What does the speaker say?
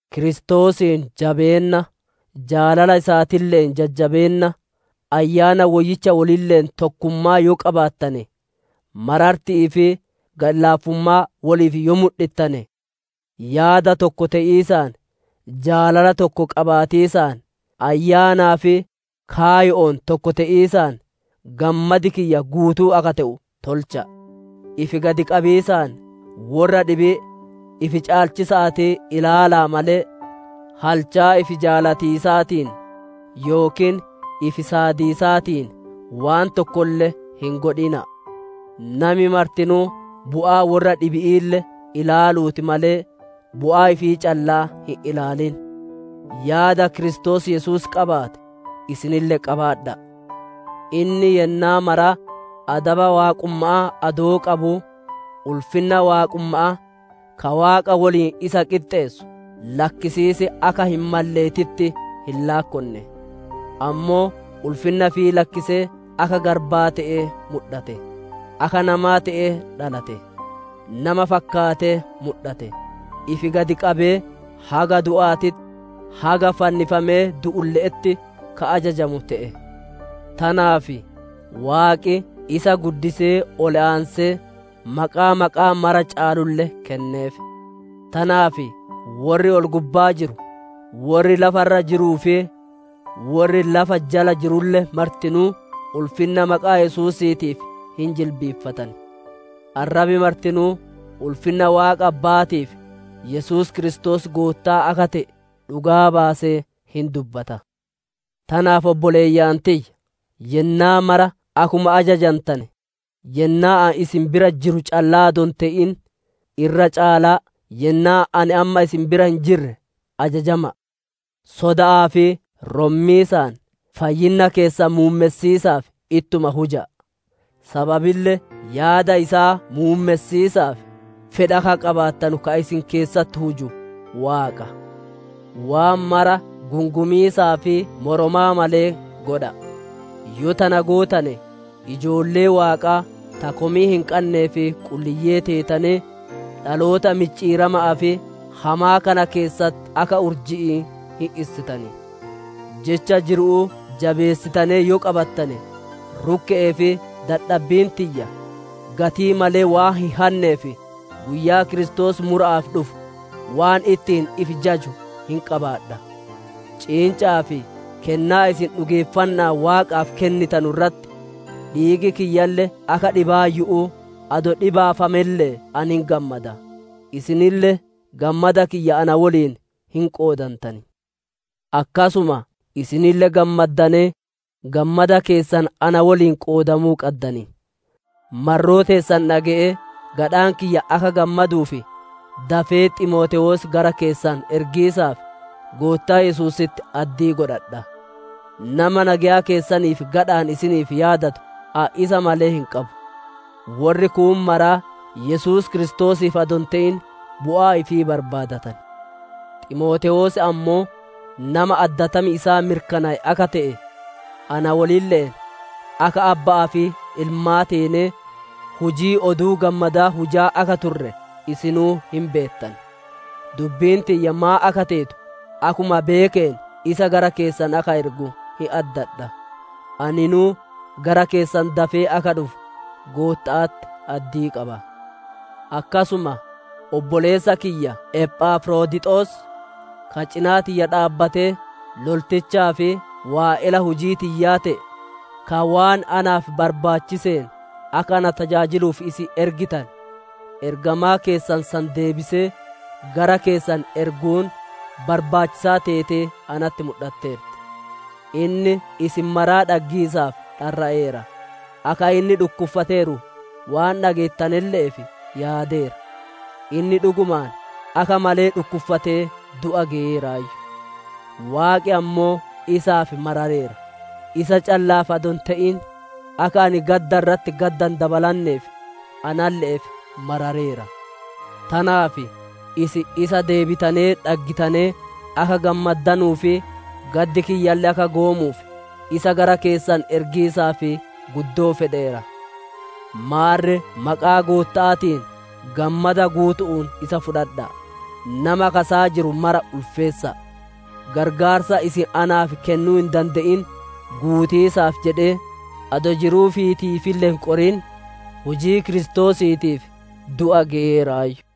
Kiristoosiin jabeenna, jaalala isaatille'een jajjabeenna, Ayyaana Woyyicha wolille'een tokkummaa yoo qabaattane, mararti'ii fi gadhi-laafummaa woliif yoo mudhittane, yaada tokko te'iisaan, jaalala tokko qabaatiisaan, ayyaanaa fi kaayo'oon tokko te'iisaan gammadi kiyya guutuu akka te'u tolcha'a. Ifi gad qabiisaan worra dhibii ifi caalchisa'aatii ilaala'a malee, halchaa ifi jaalatiisaatiin, yookiin ifi saadiisaatiin waan tokkolle hin godhina'a! Nami martinuu bu'aa worra dhibi'iille ilaaluutii malee, bu'aa ifii callaa hin ilaalin! Yaada Kiristoos Yesuus qabaate isinille qabaadha'a: Inni yennaa maraa adaba waaqumma'aa adoo qabuu, ulfinna waaqumma'aa, ka Waaqa woliin isa qixxeessu lakkisiis akka hin malleetitti hin laakkonne. Ammoo ulfinna ifii lakkisee akka garbaa te'ee mudhate; akka namaa te'ee dhalate; nama fakkaatee mudhate. Ifi gad qabee, haga du'aatitti, haga fannifamee du'ulle'etti, ka ajajamu te'e. Tanaaf Waaqi isa guddisee ol aansee, maqaa maqaa mara caalulle kenneef. Tanaaf worri ol-gubbaa jiru, worri lafa irra jiruu fi worri lafa jala jirulle martinuu, ulfinna maqaa Yesuusiitiif hin jilbiiffatan. Arrabi martinuu, ulfinna Waaqa Abba'aatiif, Yesuus Kiristoos Goottaa akka te'e, dhugaa baasee hin dubbata. Tanaaf, obboleeyyan tiyya! Yennaa mara akkuma ajajantane, yennaa ani isin bira jiru callaa adoo hin te'in, irra caalaa yennaa ani amma isin bira hin jirre ajajama'a! Soda'aa fi rommiisaan fayyinna keessan muummessiisaaf ittuma huja'a; sababille yaada isaa muummessiisaaf, fedha akka qabaattanu ka isin keessatti huju Waaqa. Waan mara gungumiisaa fi moromaa malee godha'a! Yoo tana gootane, ijoollee Waaqaa ta komii hin qannee fi qulliyyee teetanee, dhaloota micciirama'aa fi hamaa kana keessatti akka urji'ii hin issitan. Jecha jiru'uu jabeessitanee yoo qabattane, rukke'ee fi dadhabbiin tiyya gatii malee waan hin hanneef, guyyaa Kiristoos mura'aaf dhufu waan ittiin ifi jaju hin qabaadha. Ciinca'aa fi kennaa isin dhugeeffanna'aan Waaqaaf kennitanu irratti, dhiigi kiyyalle akka dhibaayyu'uu adoo dhibaafamelle'ee ani hin gammada, isinille gammada kiyya na woliin hin qoodantan. Akkasuma isinille gammaddanee, gammada keessan na woliin qoodamuu qaddan. Marroo teessan dhage'ee gadhaan kiyya akka gammaduuf, dafee Ximootewoos gara keessan ergiisaaf Goottaa Yesuusitti addii godhadha. Nama nageya keessaniif gadha'aan isiniif yaadatu ani isa malee hin qabu. Worri kuun maraa Yesuus Kiristoosiif adoo hin te'in, bu'aa ifii barbaadatan. Ximootewoos ammoo nama addatam isaa mirkanaaye akka te'e, na wolille'een akka abba'aa fi ilmaa teenee, hujii Oduu Gammadaa hujaa akka turre isinuu hin beettan. Dubbiin tiyya maan akka teetu akkuma beekeen isa gara keessan akka ergu hin addadha. Aninuu gara keessan dafee akka dhufu Gootta'atti addii qaba. Akkasuma, obboleessa kiyya Ephafrodixos, ka cinaa tiyya dhaabbatee loltichaa fi waa'ela hujii tiyyaa te'e, ka waan naaf barbaachiseen akka ana tajaajiluuf isin ergitane, ergamaa keessan san deebisee gara keessan erguun barbaachisaa teetee natti mudhatteerti. Inni isin maraa dhaggiisaaf dharra'eera; akka inni dhukkuffateeru waan dhageettanelle'eef yaadeera. Inni dhugumaan akka malee dhukkuffatee du'a geyeeraayyu. Waaqi ammoo isaaf marareera; isa calla'aaf adoo hin te'in, akka ani gadda irratti gadda hin dabalanneef analle'eef marareera. Tanaaf isin isa deebitanee dhaggitanee akka gammaddanuu fi gaddi kiyyalle akka goomuuf, isa gara keessan ergiisaaf guddoo fedheera. Maarre maqaa Gootta'aatiin gammada guutu'uun isa fudhadha'a; nama akka isaa jiru mara ulfeessa'a. Qarqaarsa isin naaf kennuu hin dande'in guutiisaaf jedhee, adoo jiruu ifiitiifille hin qorin, hujii Kiristoosiitiif du'a geyeeraayyu.